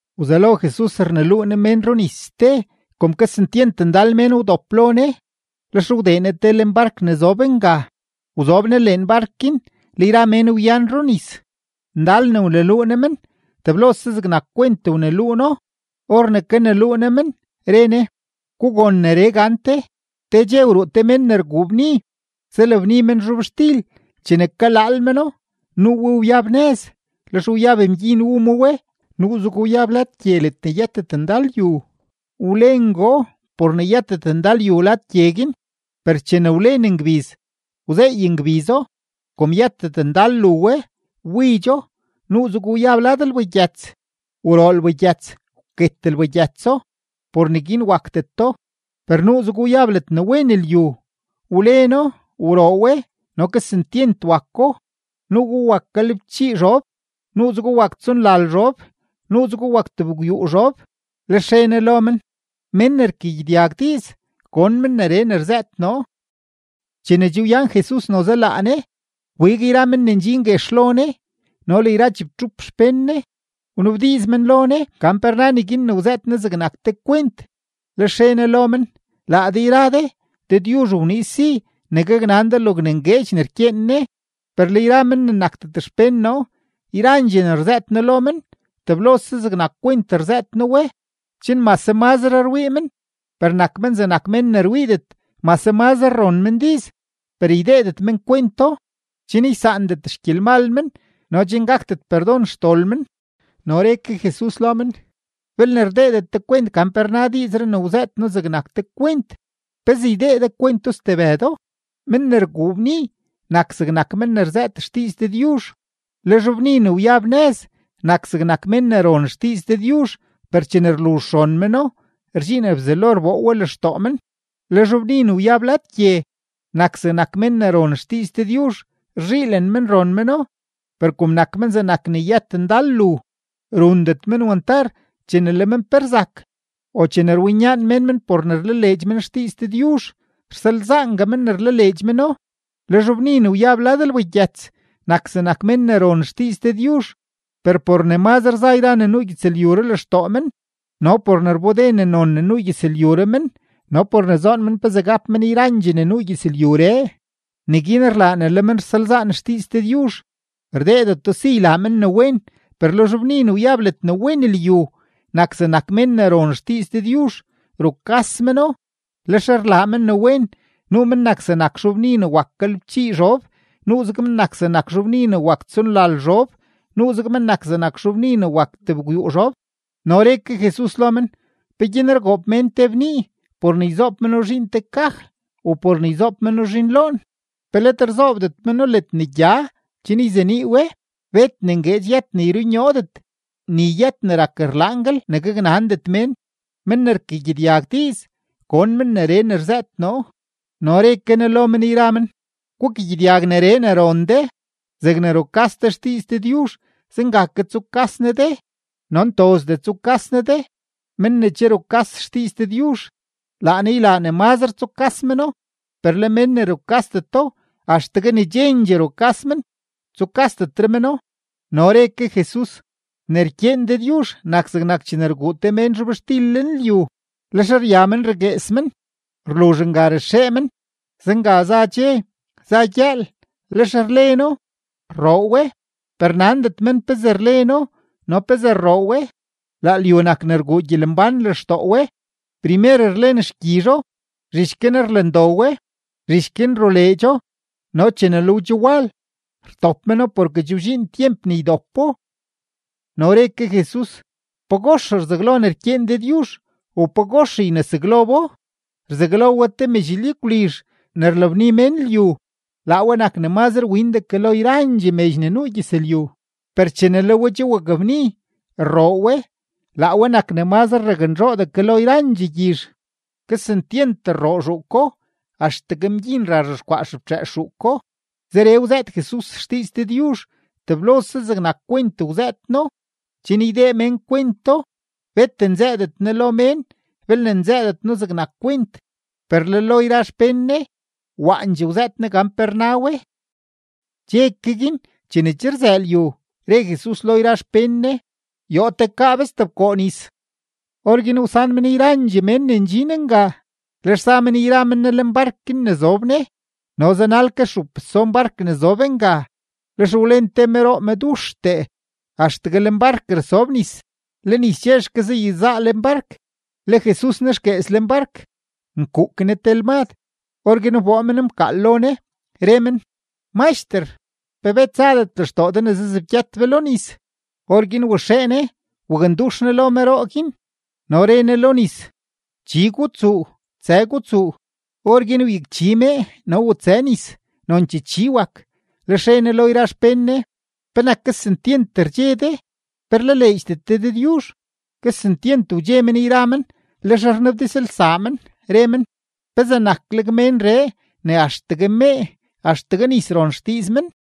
Wzelo Jesus rneluu Ne mén runis ste. Kom kesentyent ndal mén wdop lo Ne, lex wdee Ne lenbark ne zob nga, wzob Ne lenbark guin, le yra mén wyan runis. Ndal ne wneluu Ne men, teblose zegnak kwent wneluu No. Or ne kaneluu Ne men, re Ne: ―Gugon neree gante: Te dxe wruu te mén ne rguu bni, zalabni men zhobxtil. Chene kalaal meno, nuu we wyab nëz; lex wyab mgyin wu ma we. Nuuzego wyab lad gye ledne yëtet ndal yu; wlengoo por ne yëtet ndal yu lad gye guin. Per chene wlen ngbiz, wzeey ngbizo; kom yëtet ndal lu we, wbidxo. Nuuzego wyab lad lbagyëts; wroo lbagyëts, wket lbagyëtso, por neguin wakdeto. Per nuuzego wyab ledne wen lyu; wleno, wroo we, no kesentyent wako; nuu we wak galebchii zhob, nuuzego wak tsonlal zhob, nuuzego wak tebgwyuu zhob. Lex re Ne lo men: ―Men ne rkagyedyag diiz, gon men neree ne rzëët noo. Chene che wyan Jesus noze laa Ne, wbig yra men ne ndxin guex lo Ne no le yra chibtxup xpén Ne, wnabdiiz men lo Ne gan pe rna neguin ne wzëët Ne zegnak te kwent. Lex re Ne lo men: ―Laa de yra de, Dëdyuzh wniiz si ne gaknan de logne ngueedx ne rkyeen Ne; per le yra men ne nakdet xpén noo, yrandxee ne rzëët noo lo men, teblose zegnak kwent rzëët noo we; chen mase mazre rwii men, per nak men zegnak mén ne rwiidet; mase mazre ron men diiz, per ydeedet men kwento, chen ysaandet xgyelmal men no chen gakdet perdon xdol men. No re ke Jesus lo men: ―Belne rdeedet de kwent gan pe rna diizree ne wzëët noo zegnak te kwent, ¿pezee ydee de kwento stebëdo? Men ne rguu bni nak zegnak men ne rzëët xdiiz Dëdyuzh. Le zhobbni ne wyab nëz nak zegnak mén ne ron xdiiz Dëdyuzh, per chene rluzh ron meno, rdxiin Bzelo rboo we lextoo men. Le zhobbni ne wyab lad gye nak zegnak mén ne ron xdiiz Dëdyuzh; rzhiilen men ron meno, per kom nak men zegnak ne yëtet ndal lu, rundet men wantar; chene le men pe rzak o chene rwinyaan mén men por ne rlaleedx men xdiiz Dëdyuzh, rsalzaangue men ne rlaleedx meno. Le zhobbni ne wyab lad lbagyëts nak zegnak mén ne ron xdiiz Dëdyuzh, per por ne mazre za yra ne nuu gyëzlyuree lextoo men no por ne rbode ne non ne nuu gyëzlyuree men no por ne zoon men pezee gap men yrandxee ne nuu gyëzlyuree, neguin rlaa ne le men rsalzaan xdiiz Dëdyuzh; rdeedeto si ylaa men ne wen. Per le zhobbni ne wyab ledne wen lyu, nak zegnak mén ne ron xdiiz Dëdyuzh, rukas meno, lex rlaa men ne wen. Nuu men nak zegnak zhobbni ne wak galebchii zhob, nuuzeg men nak zegnak zhobbni ne wak tsonlal zhob, nuuzeg men nak zegnak zhobbni ne wak tebgwyuu zhob. No re ke Jesus lo men: ―¿Peguin rgoob mén te bnii por ne yzoob meno zhiin te kaj u por ne yzoob meno zhiin loon? ¿Pe let rzoobdet meno ledne gya chen yzenii we? Bet ne ngueedx yët ne yrunyoodet, ni yët ne rak rlaanguel ne gaknandet mén. Men ne rkagyedyag diiz, gon men neree ne rzëët noo. No re ke Ne lo men yra men: ―Gukagyedyag neree ne ron de. Zegne rukas de xdiiz Dëdyuzh, zenga ke tsukas Ne de no ntozdee tsukas Ne de. Men ne che rukas xdiiz Dëdyuzh, laa Ne ylaa ne mazre tsukas meno; per le men ne rukasdeto, axtegue ne chendxee rukas men, tsukasdetre meno. No re ke Jesus: ―Ne rkyeen Dëdyuzh nak zegnak chene rguu te mén zhobxtil lenlyu. Lex rya men raguees men; rluzh nga raxee men. Zenga za dxe, za gyëël. Lex rleno, rroo we, per nandet men pezee rleno no pezee rroo we. Laa lyu nak ne rguu gyelembán lextoo we. Primer rlen xgyizho, zhich guin rlen do we, zhich guin ruleedxo. No chene le we che wal, rtop meno porke che wdxiin tyemp ne ydopo. No re ke Jesus: ―¿Pagox rzaglo ne rkyeen Dëdyuzh, u pagox ynesaglo bo? Rzaglo we te medx lyagwlizh ne rlabni mén lyu. Laa we nak ne mazre windee ke lo yrandxee medx ne nuu gyëzlyu. Per chene le we che wakbni, rroo we, laa we nak ne mazre raknzhoodee ke lo yrandxee gyizh; kesentyent rroo zhuuko, axtegue mgyin ra rzhexkwaa xeftxëës zhuuko. Zeree wzëët Jesus xdiiz Dëdyuzh, teblose zegnak kwent wzëët No, chen ydee mén kwento. Bet nzëëdet Ne lo mén belne nzëëdet No zegnak kwent; per le lo yra xpén Ne, waandxee wzëët Ne gan pe rna we. Dxe ke guin, chene che rzëë lyu, re Jesus lo yra xpén Ne: ―Yoo tekaa be stebkoo nis. Orguin wsan men yrandxee mén ne ndxin nga, lex za men yra men Ne lenbark guin ne zob Ne; no zanal ke stxup stson bark ne zob nga. Lex wlen te meroo meduxtee, axtegue lenbark rasob nis, le nis chexke zayezaa lenbark. Le Jesus nexguees lenbark, nkuuk Ne te lmad. Orguin wboo men mkaal lo Ne, re men: ―¡Maxter! ¿Pe bet zadet lextoo de ne sebgyët be lo nis? Orguin waxee Ne wakndux Ne lo meroo guin, no re Ne lo nis: ―¡Chi gutsuu! ¡Tsë gutsuu! Orguin wyakchi mee, no wutsë nis, nonchee chi wak. Lex re Ne lo yra xpén Ne: ―¿Penak kesentyent rdxe de? ¿Pe rlaleedxdet de Dëdyuzh? Kesentyent wdxe men yra men, lex rnabdizlsaa men, re men: ―¿Pezee nakleg ménree ne axtegue mee, axtegue nis ron xdiiz men?